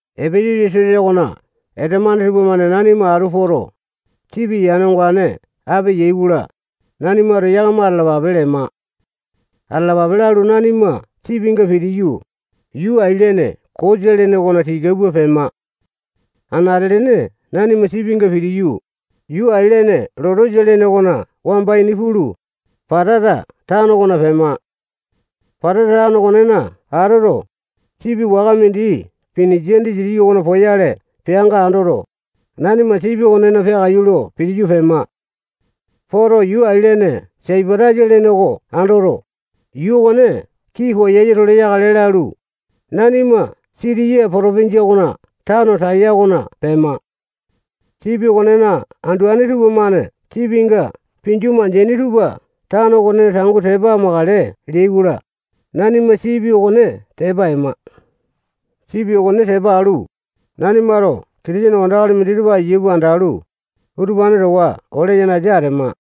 Epesasa sosa okona esamane tupamane nanima atu poto, sipi yane ongane ape yai-kola, nanimato yakama atalapape lema. Atalapape lalu, nanima sipinga pitiyu, yuu ailene Kosa lene okona tika pua pema. Anate-lene nanima sipinga pitiyu, yuu ailene Lotesa lene okona wamba ini pulu, Patata tano okona pema. Patata tano okonena atoto, sipi waka mindi Pinisia disitiki okona poyale peanga andoto, nanima sipi okonena peakaiyu lo pitiyu pema. Poto, yuu ailene Saipatasa lene oko andoto, yuu okone kii koyasa-tole yakale lalu, nanima Sitiya potopinjia okona tano Taya okona pema. Sipi okonena anduane tupamane sipinga pinju mandeaini tupa tano okonena tangu tepa amakale leai-kola, nanima sipi okone tepa ema. Sipi okone tepa alu, nanimato Kitisene wandakali minditupa aiya pua andalu, utupane towa ole yanasa atema.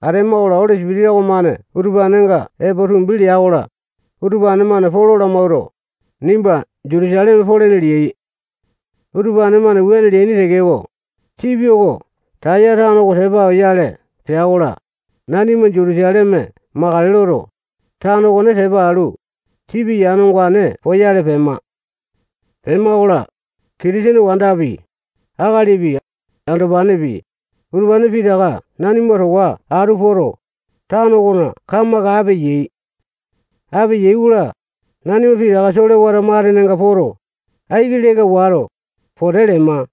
Atema-kola, Oli Sipitisa okomane utupanenga epo tumbi lea-kola, utupane-mane Polo lamawuato, nimba Jutusaleme polene leai. Utupane-mane wuane leaini tekeko, sipi oko Taya tano oko tepa oyale pea-kola, nanima Jutusaleme makale loto, tano oko tepa alu, sipi yane ongane poyale pema. Pema-kola, Kitisene wandapi, akalipi, andopanepi, utupane pitaka nanima towa atu poto, tano okona kamaka ape yai. Ape yai-kola, nanima pitaka solewata matenenga poto, aiki leka wato, pote lema.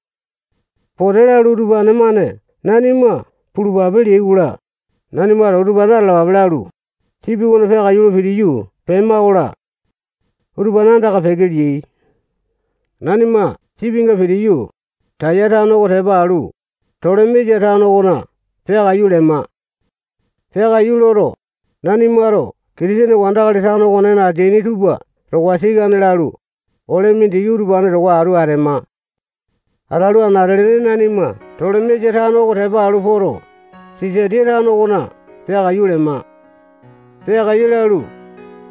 Pote lalu, utupane-mane nanima pulupape leai-kola, nanimato utupane atalapape lalu, sipi okona peakaiyu lo pitiyu pema-kola, utupane andaka peke leai. Nanima sipinga pitiyu, Taya tano okone tepa alu, Tolemesa tano okona peakaiyu lema. Peakaiyu loto, nanimato Kitisene wandakali tano okonena ateaini tupa towa sikane lalu, ole mindiki utupane towa atu atema. Atalu, anate-lene nanima Tolemesa tano oko tepa alu poto, Sisatiya tano okona peakaiyu lema. Peakaiyu lalu,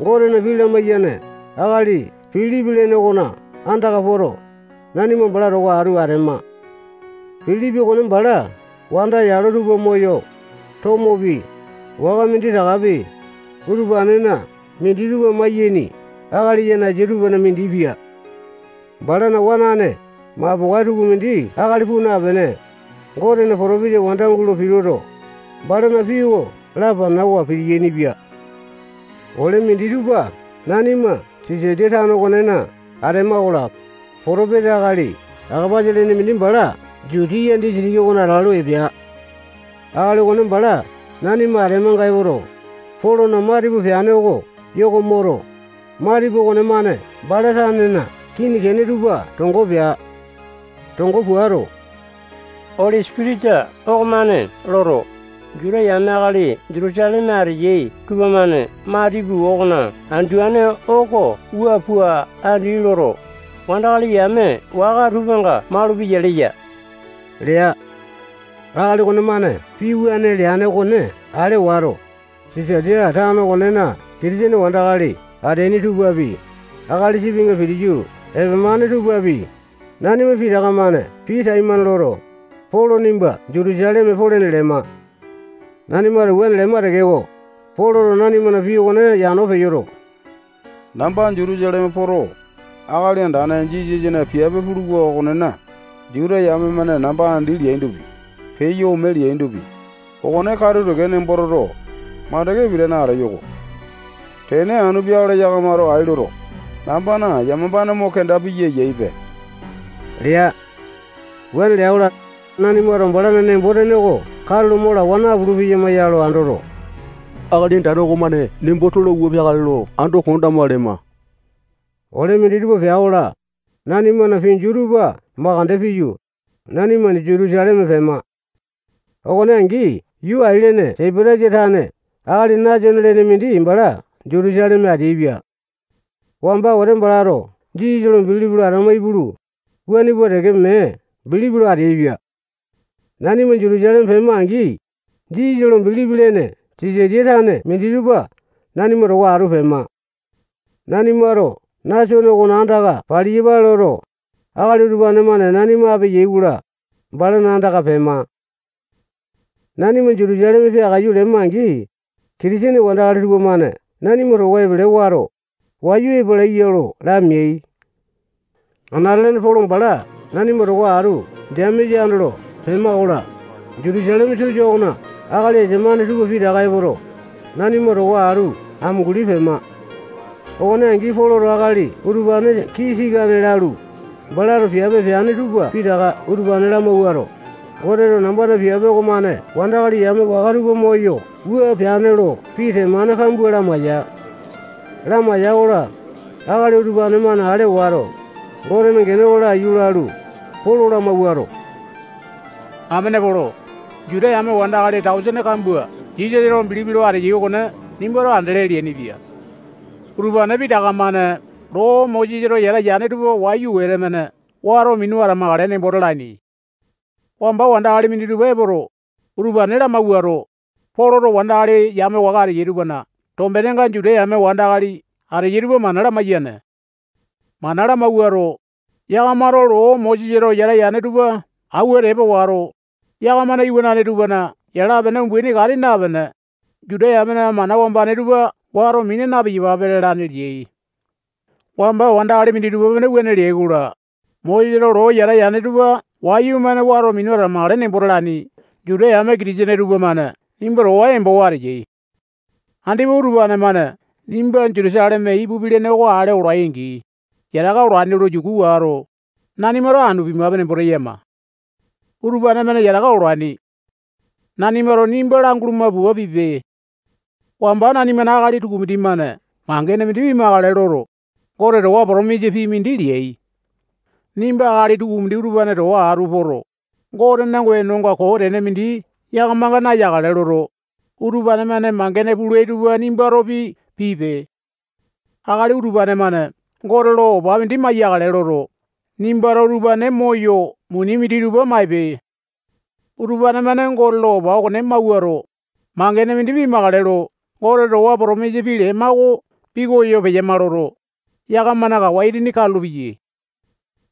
Gotena pii lamaiyane akali Pilipi okona andaka poto, nanima bala towa atu atema. Pilipi okone bala wanda yalo tupa moyo, tomopi, waka minditakapi, utupanena minditupa maiyaini akali yanasa tupana mindi pia. Balana wanane mapokae tukumindi akali puu napene, Gotena potopesa wanda gulo pituto, balana pii oko lapanawa pitiyaini-pia. Ole minditupa nanima Sisaliya tano okonena atema-kola, potopesa akali Akapasa lene mindi bala Jutiya disitiki okona atalu, epea. Akali okone bala nanima atemanga epoto, Polona matipu peane oko yoko moto, matipu okonemane bala tanena kini kene tupa tongo pea. Tongo puato, Oli Sipitisa okomane loto, Juta yame akali Jutusaleme ateyai tupamane matipu okona anduane oko wua pua andi loto, wandakali yame waka tupanga malupeyai leya lea. Akali okonemane pii wuane leane okone ale wato, Sisaliya tano okonena Kitisene wandakali ateaini tupapi, akali sipinga pitiyu epemane tupapi, nanima pitaka-mane pii taimane loto, Polo nimba Jutusaleme polene lema. Nanimato wuane lema tekeko, Poloto nanimana pii okone yano peyoto, namba Jutusaleme poto, Akali Andane Jisasana piape puluwa okonena, Juta yame-mane namba andi leaindopi, peyo ome leaindopi, okone katu teke nembo toto, makande pitane ateyo-ko. Tene anu peakale yakamato ai loto, nambana yamapane mo kenda piya eyaipe lea. Wuane lea-kola, nanimato balana nembo-tene oko katulo mo lawa napulu-peyama ya lo andoto, Akali Andane okomane nembo tola pua peakale lo ando kondama lema. Ole minditupa pea-kola, nanimana pinju tupa makande piyu, nanima Jutusaleme pema. Okone angi yuu ailene Saipatasa tane akali Nasone lene mindi bala Jutusaleme ateaipia. Wamba wete balato Jisasa bilipi lo atama ipulu, wuane pua teke mee bilipi lo ateaipia. Nanima Jutusaleme pema-angi, Jisasa lo bilipi lene Sisatiya tane minditupa nanima towa atu pema. Nanimato Nasone okona andaka paliyapale loto, akali utupane-mane nanima ape yai-kola, balana andaka pema. Nanima Jutusaleme peakaiyu lema-angi, Kitisene wandakali tupamane nanima towa epele wato, wayu epalaiya lo lameai. Anate-lene Polo bala nanima towa atu Jemesa andolo pema-kola, Jutusaleme sosa okona akali esamane tupa pitaka epoto, nanima towa atu amunguli pema. Okone angi, Poloto akali utupane kii sikane lalu, balato piape peane tupa pitaka utupane lamawuato, Goteto nambana piape okomane wandakali yame waka tupa moyo wua peane lo pii temane kambua lamaiya. Lamaiya-kola, akali utupane-mane ale wato, Gotena gene oko laiyu lalu, Polo lamawuato, amene Polo, Juta yame wandakali tausene kambua Jisasa lo bilipi lo ateyai okone nimbato andele leainipia. Utupane pitaka-mane loo Mosesato yata yane tupa wayu wete-mane wato minu atamakale nembo talaini. Wamba wandakali minditupa epoto, utupane lamawuato, Poloto wandakali yame waka ateyai tupana tombenenga Juta yame wandakali ateyai tupa mana lamaiyane. Mana lamawuato, yakamato loo Mosesato yata yane tupa awua tepa wato, yakamana iwanane tupana yala-pene umbaini kati napene, Juta yamena mana wambane tupa wato mina na-piyapape lalane leai. Wamba wandakali minditupa-mane wuane leai-kola, Mosesato loo yata yane tupa wayumane wato minu atamakale nembo talaini Juta yame Kitisene tupamane nimba towa embowa ateyai. Andipa utupane-mane nimba Jutusaleme ipupi lene oko ale olai-angi, yataka olaini lo yuku wato, nanimato anu pimape nembo teyama. Utupane-mane yataka olaini. Nanimato nimba languluma pua pipe. Wamba nanimana akali tukumindi-mane mangene mindi pimakale loto, Gote towa potomisa pii mindi leai. Nimba akali tukumindi utupane towa atu poto, Gotena wenonga koo tene mindi yakamanga nayakale loto, utupane-mane mangene pulai tupa nimbatopi pipe. Akali utupane-mane Gote lo opa mindi maiyakale loto, nimbato utupane moyo muni minditupa maipe. Utupane-mane Gote lo opa okone mawuato, mangene mindi pimakale lo Gote towa potomisa pii lema oko pikoyo peyama loto, yakamana kawa itini katulu-peyai.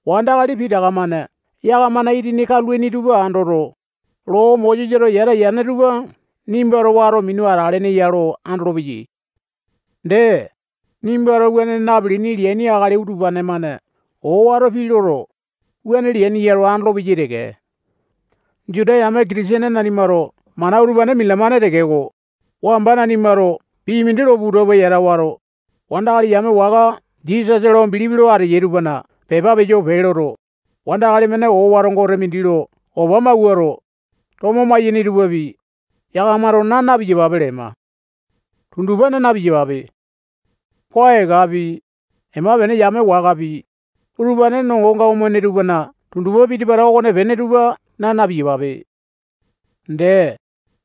Wandakali pitaka-mane yakamana itini katulaini tupa andoto, loo Mosesato yata yane tupa nimbato wato minu atalene ya lo andolopeyai. Dee, nimbato wuane napilini leaini akali utupane-mane owato pii loto, wuane leaini ya lo andolopeyai teke. Juta yame Kitisene nanimato mana utupane minalamane tekeko, wamba nanimato pii mindi lo puta pua yata wato, wandakali yame waka Jisasa lo bilipi lo ateyai tupana pepa peyo pee loto, wandakali-mane owato gote mindi lo opa mawuato, tomo maiyene tupapi, yakamato naa na-piyapape lema. Tundupa naa na-piyapape. Koa ekapi, ema-pene yame wakapi, utupane nongonga omene tupana tundupa piti-pata okonepene tupa naa na-piyapape. Dee,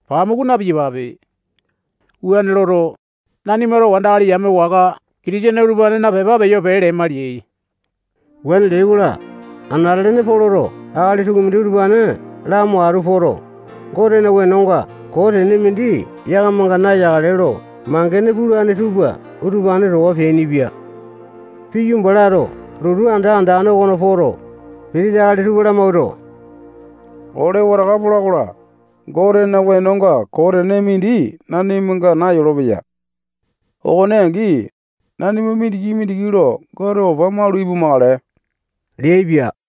pamuku na-piyapape. Wuane loto, nanimato wandakali yame waka Kitisene utupanena pepa peyo pee lema leai. Wuane leai-kola, anate-lene Poloto akali tukumindi utupane lamo atu poto, Gotena wenonga koo tene mindi yakamanga nayakale lo mangene pulane tupa utupane towa peainipia. Piyu, balato lotu anda andane okona poto, pitisa akali tupa lamawuato, ole wataka pola-kola, Gotena wenonga koo tene mindi nanimanga nayolopeya. Okone angi, nanima mindiki-mindiki lo Gote opa malu ipumakale leaipia.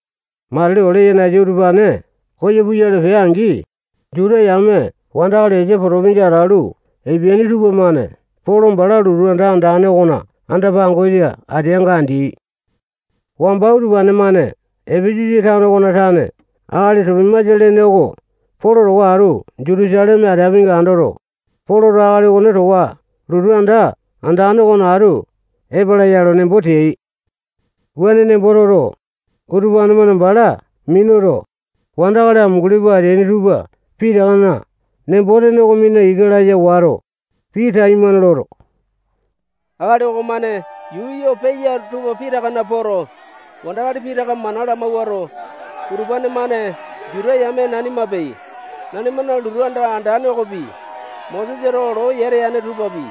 Matili ole yanasa utupane koyo puyale pea-angi, Juta yame wandakali Esia potopinjia atalu epeaini tupamane Polo bala lotu anda andane okona anda-pangosa ateanga andeai. Wamba utupane-mane Epesasa tano okona tane akali Topimasa lene oko Polo towa atu Jutusaleme ateapinga andoto, Poloto akali okone towa lotu anda andane okona atu epala ya lo nembo teai. Wuane nemboto toto, utupane-mane bala minuto, wandakali amunguli pua ateaini tupa pitakana nembo-tene oko mina ika laya wato, pii taimane loto, akali okomane yuu yo peya tupa pitakana poto, wandakali pitaka mana lamawuato, utupane-mane Juta yame nanimapi, nanimana lotu anda andane okopi, Mosesato loo yata yane tupapi,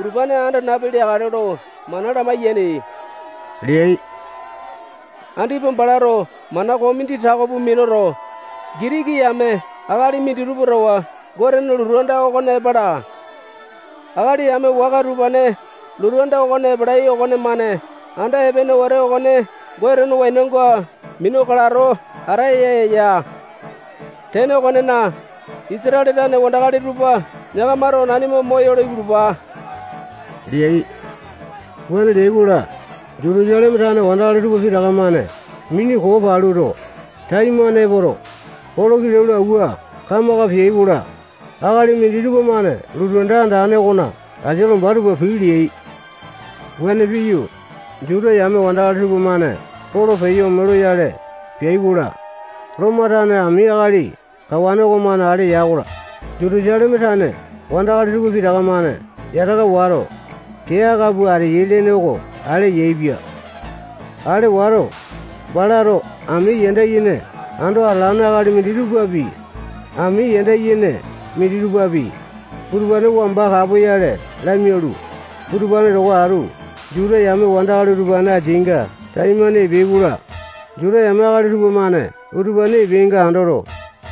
utupane anda napi leakale lo mana lamaiyane leai. Andipa balato mana koo mindi tako pua minuto, Gitiki yame akali minditupa towa Gotena lotu anda okona epala. Akali yame waka utupane lotu anda okona epalai okonemane anda epene wete okone Gotena wenonga minu kalato ataya eya. Tene okonena, Isatale tane wandakali tupa yakamato nanima moyolo ipulupa leai. Wuane leai-kola, Jutusaleme tane wandakali tupa pitaka-mane mini koo paluto, taimane epoto, Polo kilau lo awua kamaka peai-kola, akali minditupa-mane lotu anda andane okona asia lomba tupa pii leai. Wuane piyu, Juta yame wandakali tupamane Polo peyo ome loyale peai-kola, Lomo tane ami akali kawane okomane ale ya-kola, Jutusaleme tane wandakali tupa pitaka-mane yataka wato, kee aka pua ateyai lene oko ale yaepia. Ale wato, balato ami yanda yene ando atalane akali minditupapi, ami yanda yene minditupapi, utupane wamba kapoyale lamialu, utupane towa atu Juta yame wandakali utupane ateainga taimane epeai-kola, Juta yame akali tupamane utupane epeainga andoto,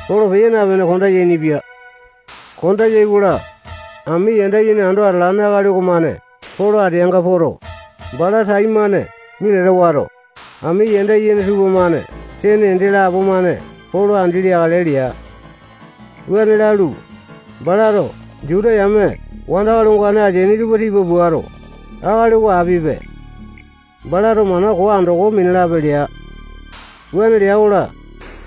Polo peya napene konda yainipia. Konda yai-kola, ami yanda yene ando atalane akali okomane Polo ateanga poto, bala taimane minata wato, ami yanda yene tupamane sene ende lapo-mane Polo andi leakale lea. Wuane lalu, balato Juta yame wandakali ongane ateaini tupa tipa puato, akali oko apipe. Balato mana koo andoko minalape lea. Wuane lea-kola,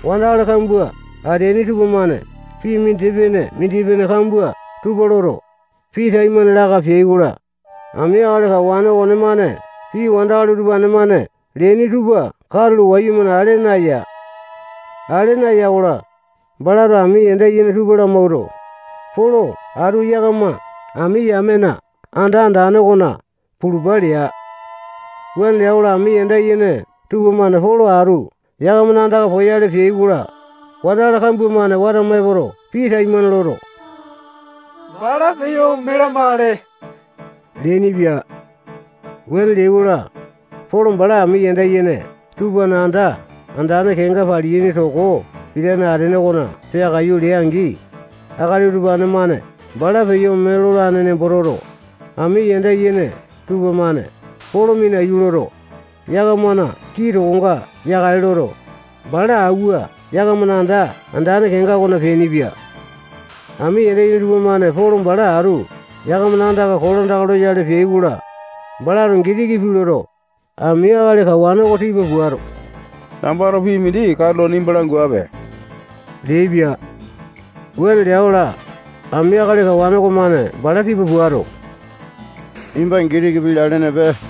wandakali kambua ateaini tupamane pii mindipene-mindipene kambua tupa loto, pii taimane laka peai-kola, ami akali kawane okonemane pii wandakali utupane-mane leaini tupa katulo wayumane ale naya. Ale naya-kola, balato ami yanda yene tupa lamawuato, Polo atu yakama ami yamena anda andane okona pulupa lea. Wuane lea-kola, ami yanda yene tupamane Polo atu yakamana andaka poyale peai-kola, wandakali kambua-mane watama epoto, pii taimane loto, bala peyo ome lamakale leainipia. Wuane leai-kola, Polo bala ami yanda yene tupana anda andane kenga palaini toko pitane atene okona peakaiyu lea-angi, akali utupane-mane bala peyo ome lolane nembo toto, ami yanda yene tupamane Polo minaiyu loto, yakamana kii tokonga yakale loto, bala awua yakamana anda andane kenga okona peainipia. Ami yanda yene tupamane Polo bala atu yakamana andaka kolandaka loyale peai-kola, balato Gitiki pii loto, ami akali kawane oko tipa puato, nambato pii mindi katulo nimba languape leaipia. Wuane lea-kola, ami akali kawane okomane bala tipa puato, nimbato Gitiki pii lalenepe.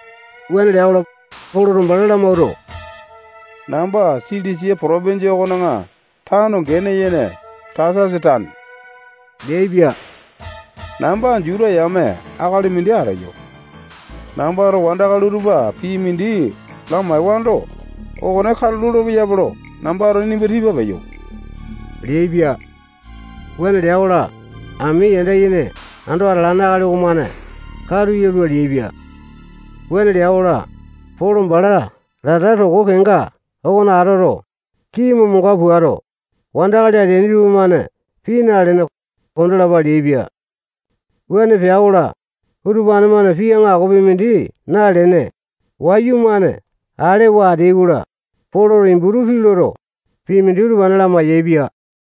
Wuane lea-kola, Poloto bala lamawuato, namba Silisia potopinjia okona tano gene yene Tasasa tane leaipia. Namba Juta yame akali mindi ateyo. Nambato wandakali utupa pii mindi lamaewando, okone katu lolo-peyape lo nambato nimba tipa peyo leaipia. Wuane lea-kola, ami yanda yene ando atalane akali okomane, katu yalua leaipia. Wuane lea-kola, Polo bala lata toko kenga okona atoto, kini momonga puato, wandakali ateaini tupamane pii nalene, kondalapa leaipia. Wuane pea-kola, utupane-mane pii aŋakopi mindi nalene, wayumane alewa ateai-kola, Poloto Iputu pii loto, pii mindi utupane lamai-yaepia.